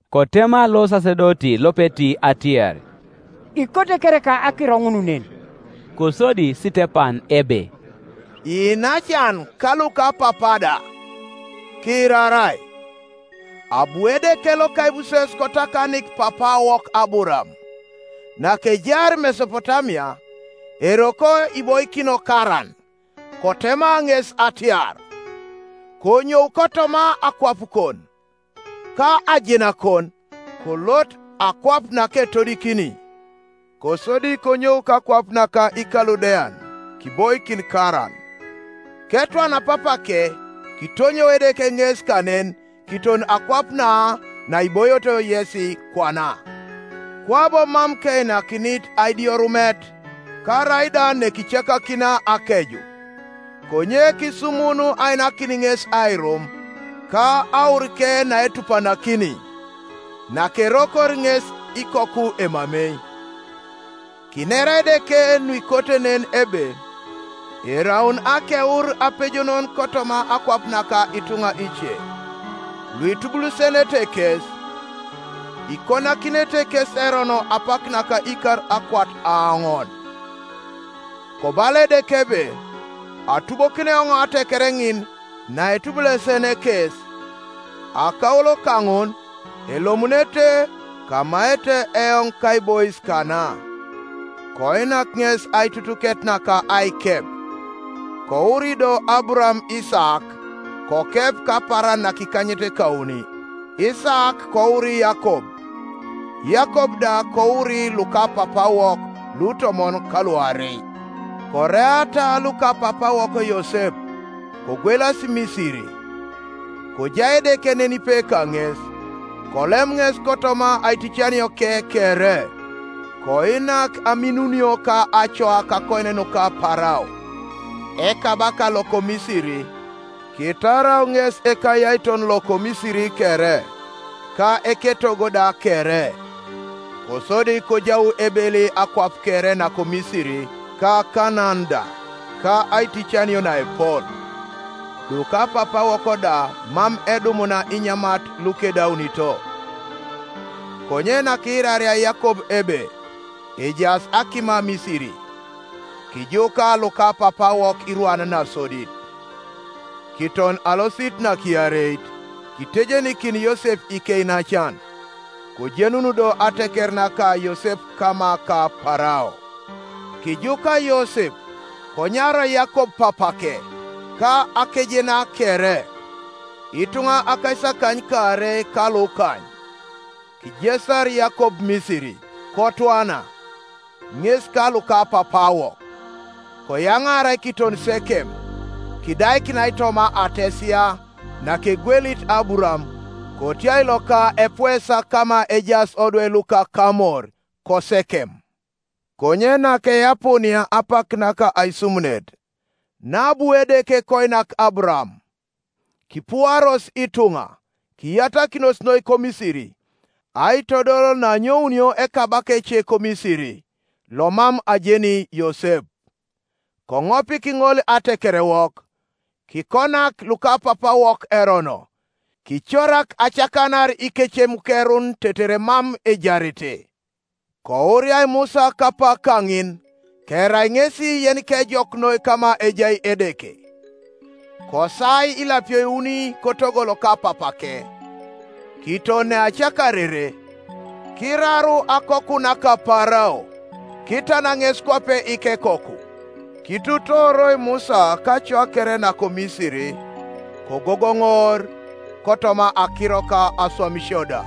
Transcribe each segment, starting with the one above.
Kotema losasedoti lopeti atiar, “Ikote kereka akiro ŋun nen?” Kosodi Sitepan ebe, “Iinacan ka lukapapa da, kiirarai. Abu Edeke loka aibuses kotakanik papaawok Aburaam, nakejaar Mesopotamia, eroko iboikino Karan, kotema ŋes atiar, ‘Konyou kotoma akwapukon, ka ajenakon, kolot akwap naketodikini.’ Kosodi konyou kakwap naka Ikaludean, kiboikin Karan. Ketwana papake kitonyou Edeke ŋes kanen kiton akwap na naiboito yesi kwana; kwabo mam keinakinit adioirumet, karaida nekicakakina akeju, konye kisumun ainakin ŋes airum, ka aurike naetupanakini, nakerokor ŋes ikoku emamei. Kinera Edeke nuikote nen ebe eraun akeur apejonon kotoma akwap naka ituŋa ice, luitubulesenete kes, ikonakinete kes erono apak naka ikar akwat aoŋon. Kobala Edeke ebe, ‘Atubokini eoŋ ateker ŋin naitubulesene kes; akaulo kaŋun elomunete, kamaete eoŋ kaibois kana.’ Koinak ŋes aitutuket naka aikep. Kouri do Aburaam Isaak, kokep kapaaran nakikanyetekauni; Isaak kouri Yakob, Yakob da kouri lukapapaawok lutomon ka luarei. “Koreata lukapapaawok Yosep, kogwelasi Misiri. Kojai Edeke nenipe kaŋes. Kolem ŋes kotoma aiticanioke kere, koinak aminunio ka acoa kakonyen nuka Parao, ekabaka loko Misiri, kitarau ŋes ekayaiton loko Misiri kere, ka eketogo da kere. Kosodi kojau ebeli akwap kere nako Misiri ka Kanaan da, ka aiticanio naepol, lukapapaawok da mam edumuna inyamat lukedaunito. Konye nakiiraria Yakob ebe ejaas akima Misiri, kijuka lukapapaawok irwan nasodit. Kiton alosit nakiareit kitejenikin Yosep ikeinacan, kojenun do ateker naka Yosep kama ka Parao. Kijuka Yosep, konyarau Yakob papake, ka akejena kere, ituŋa akaisakanykaarei ka lukany. Kijesar Yakob Misiri, Kotwana, ŋes ka lukapapaawok; koyaŋaarai kiton Sekem, kidaikinai toma ates ya nakegwelit Aburaam kotiai loka epuesa kama ejaas odwe luka Kamor koSekem. “Konye nakeapuunia apak naka aisumunet naabu Edeke koinak Aburaam, kipuaros ituŋa, kiyatakinos noi koMisiri, aitodol naanyounio ekabaka ece koMisiri, lomam ajeni Yosep. Koŋopik ŋol atekerewok, kikonak lukapapaawok erono, kicorak acakanar ikecemukerun tetere mam ejarete. Kouriai Musa kapak kaŋin, kerai ŋesi yenikejok noi kama ejai Edeke. Kosaai ilapio iuni kotogo loka papake; kiton neacakarere, kiraru akoku naka Parao, kitan ŋes kwape ikekoku. Kituutooroi Musa kacoa kere nako Misiri, kogogoŋor kotoma akiro ka aswamisio da.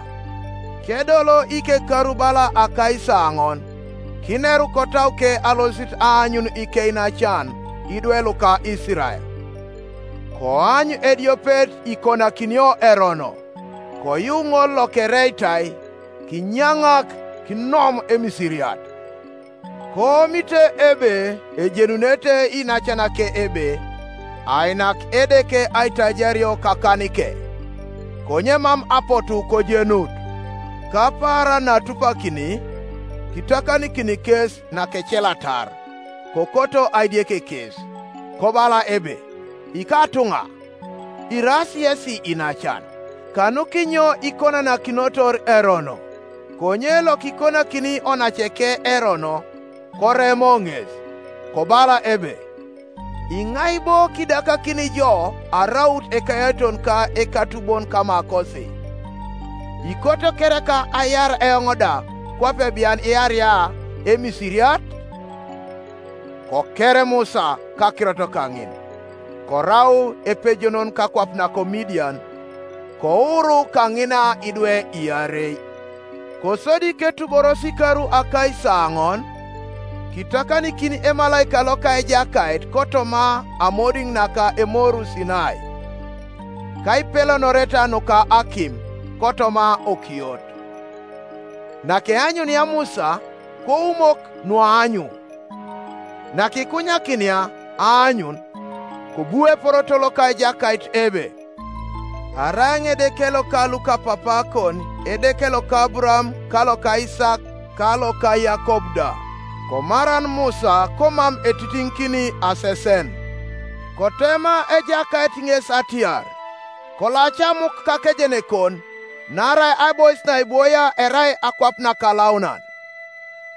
“Kedolo ikekaru bala akaisaoŋon, kineru kotauke alosit aanyun ikeinacan idwe luka Isirael. Koany ediopet ikonakinio erono, koyu ŋol lokereitai kinyaŋak kinom Emisiriat: koomit ebe ejenunete iinacanake ebe ainak Edeke aitajario kakanike; konye mam apotu kojenut. Kapaaran naatupakini kitakanikin kes nakecelatar, kokoto aidiek kes, kobala ebe, ‘Ikatuŋa, iraas yesi iinacan, kanukinyo ikonanakinotor erono?’ Konye lokikonakini onaceke erono koremo ŋes, kobala ebe, ‘Iŋai bo kiidakakini jo araut ekayaiton ka ekatubon kamakosi? Ikoto kereka aiar eoŋ da, kwape bian iaria Emisiriat?’ Koker Musa kakirot kaŋin, korau epejonon kakwap nako Midian, kouru kaŋina idwe iarei. “Kosodi ketuboros ikar akaisaoŋon, kitakanikin emalaika loka Ejakait kotoma amodiŋ naka Emoru Sinai, kaipelonoreta nuka akim kotoma okiot. Nakeanyunia Musa, koumok nuaanyu; nakikunyakinia aanyun, kobu eporoto loka Ejakait ebe, ‘Arai eoŋ Edeke loka lukapapaakon, Edeke loka Aburaam, ka loka Isaak, ka loka Yakob da.’ Komaran Musa, komam etitiŋikini asesen. Kotema Ejakait ŋes atiar, ‘Kolaca amuk kakejenekon, naarai aibois naibwoia erai akwap nakalaunan.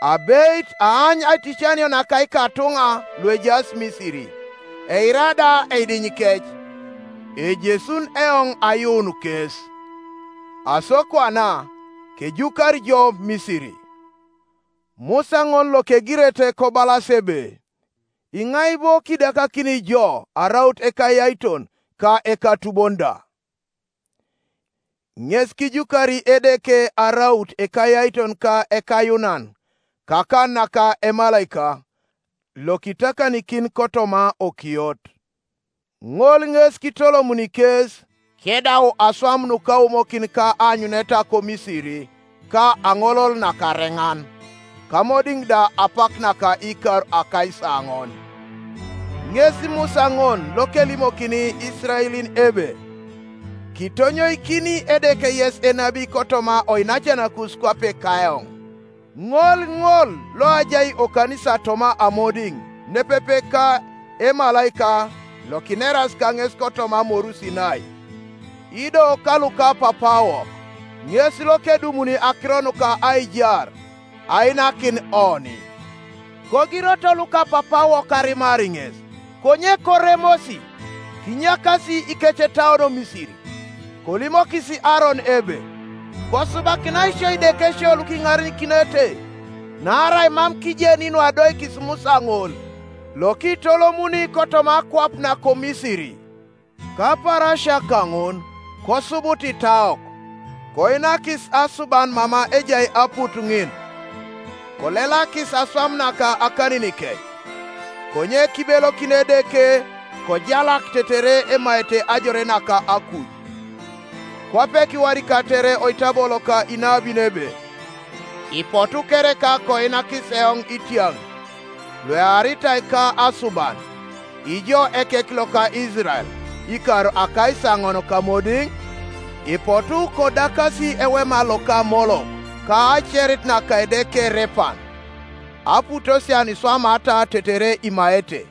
Abeit aany aiticanio naka ikatuŋa luejaas Misiri, eira da eidinyikec, ejesun eoŋ ayuun kes. Aso kwana, kejukari jo Misiri.’ “Musa ŋol lokegirete kobalas ebe, ‘Iŋai bo kiidakakini jo araut ekayaiton ka ekatubon da?’ ŋes kijukari Edeke araut ekayaiton ka ekayuunan kakan naka emalaika lokitakanikin kotoma okiot. Ŋol ŋes kitolomuni kes, kedau aswam nukaumokin ka aanyuneta koMisiri ka Aŋolol Nakareŋan, kamodiŋ da apak naka ikar akaisaoŋon. Ŋes Musa ŋol lokelimokini Isiraelin ebe, ‘Kitonyoikini Edeke yes enabi kotoma oinacanakus kwape kaeoŋ.’ Ŋol ŋol loajai okanisa toma amodiŋ nepepe ka emalaika Iokineras kaŋes kotoma Moru Sinai, ido kalukapapaawok; ŋes lokedumuni akiro nuka aijar ainakin oni. Kogiroto lukapapaawok arimar ŋes, konye koremosi, kinyakasi ikecetauon Misiri, kolimokis Aaron ebe, ‘Kosubakinai sio idekesio lukiŋarenikinete; naarai mam kijeni nuadoikis Musa ŋol, lokiitolomuni kotoma akwap nako Misiri.’ Kapaarasia kaŋun kosubut itaok, koinakis asuban mama ejai aput ŋin, kolelakis aswam naka akaninikec. Konye kibelokin Edeke, kojalak tetere emaete ajore naka akuj; kwape kiwadikatere oitabo loka inabin ebe, ‘Ipotu kereka koinakis eoŋ itiaŋ luearitai ka asuban, Ŋo ekek loka Isirael, ikar akaisaoŋon kamodiŋ? Ipotu kodakasi ewema loka Molok, Ka aacerit naka edeke Repan, Aputosia nuiswamata tetere imaete: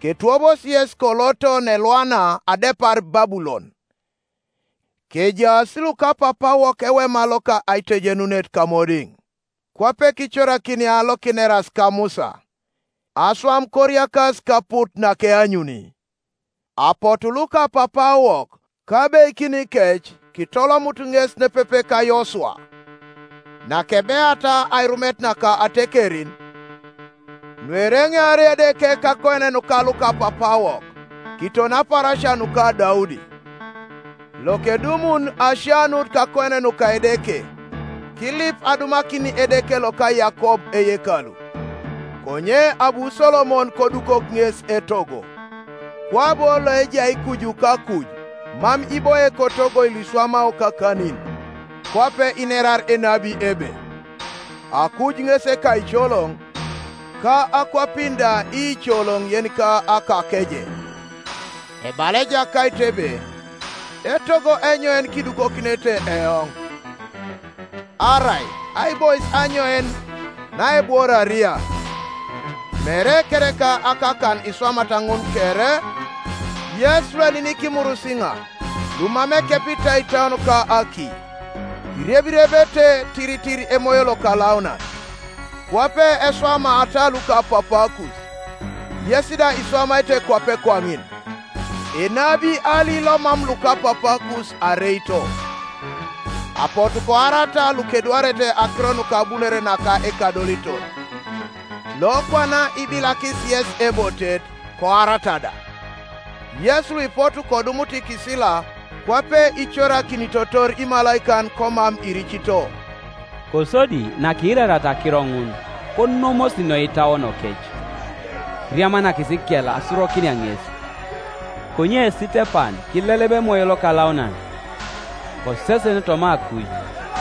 Ketwobosi yes koloto neelwana adepar Babulon.’ “Kejaas lukapapaawok ewema loka aitejenunet kamodiŋ, kwape kicorakinia lokineras ka Musa, aswam koriakas kaput nakeanyuni. Apotu lukapapaawok, kabeikinikec kitolomut ŋes nepepe ka Yosua, nakebeata airumet naka atekerin, nuereŋear Edeke kakonyen nuka lukapapaawok, kiton apaarasia nuka Daudi; lokedumun asianut kakonyen nuka Edeke, kilip adumakin Edeke loka Yakob eyekalu. Konye abu Solomon kodukok ŋes etogo. Kwabo Loejai kuju kakuj mam iboie kotogoi luiswamao kakanin; kwape inerar enabi ebe, ‘Akuj ŋes ekaicoloŋ, Ka akwapin da iicoloŋ yenika akakeje, Ebala Ejakait ebe, Etogo enyoin kidukokinete eoŋ? Arai aibois anyoin naebworaria? Mere kereka akakan iswamat ŋun kere?’ “Yes lueninik imurisiŋa, lumam ekepitai itauon ka aki, irebirebete tiritir Emoyo Lokalaunan. Kwape eswamaata lukapapaakus, yes da iswamaete kwape kwaŋin. Enabi ali lomam lukapapaakus areito? Apotu koarata lukedwarete akiro nuka abunore naka Ekadoliton; lokwana ibilakis yesi ebotet, koarata da, yes luipotu kodumut ikisila kwape icorakinitotor imalaikan, komam iricito.” Kosodi nakiirariata akiro ŋun, konomos noi itauonokec, kiriamanakis ikel asurokinia ŋes. Konye Sitepan kileleba Emoyo Lokalaunan, kosesen toma akuj,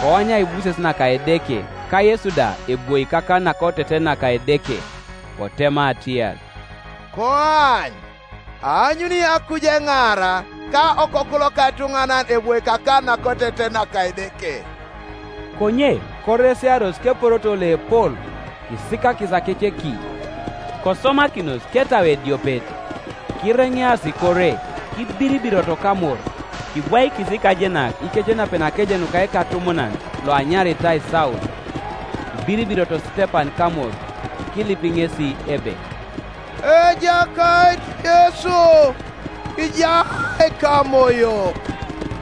koany aibuses naka Edeke, ka Yesu da ebwoi kakan nakoteten naka Edeke; kotema atiar, “Koany, aanyuni akuj eŋaara, ka Okoku loka etuŋanan ebwoi kakan nakoteten naka Edeke.” Konye koresiaros keporoto loepol, kisikakis akeceki, kosomakinos ketau ediopet. Kireŋeasi kore, kibiribiroto kamor; kibwaikis ikajenak ikecenapen akeje nuka ekatumunan loanyaritai Saul. Kibiribiroto Sitepan kamor, kilip ŋesi ebe, “Ejakait Yesu, kiira ekamoyo.”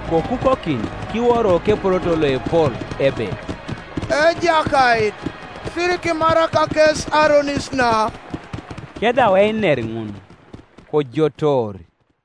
Kokukokin kiworo keporoto loepol ebe, “Ejakait, sirikimarak kes aronis na.” Kedau einer ŋun, kojotoor.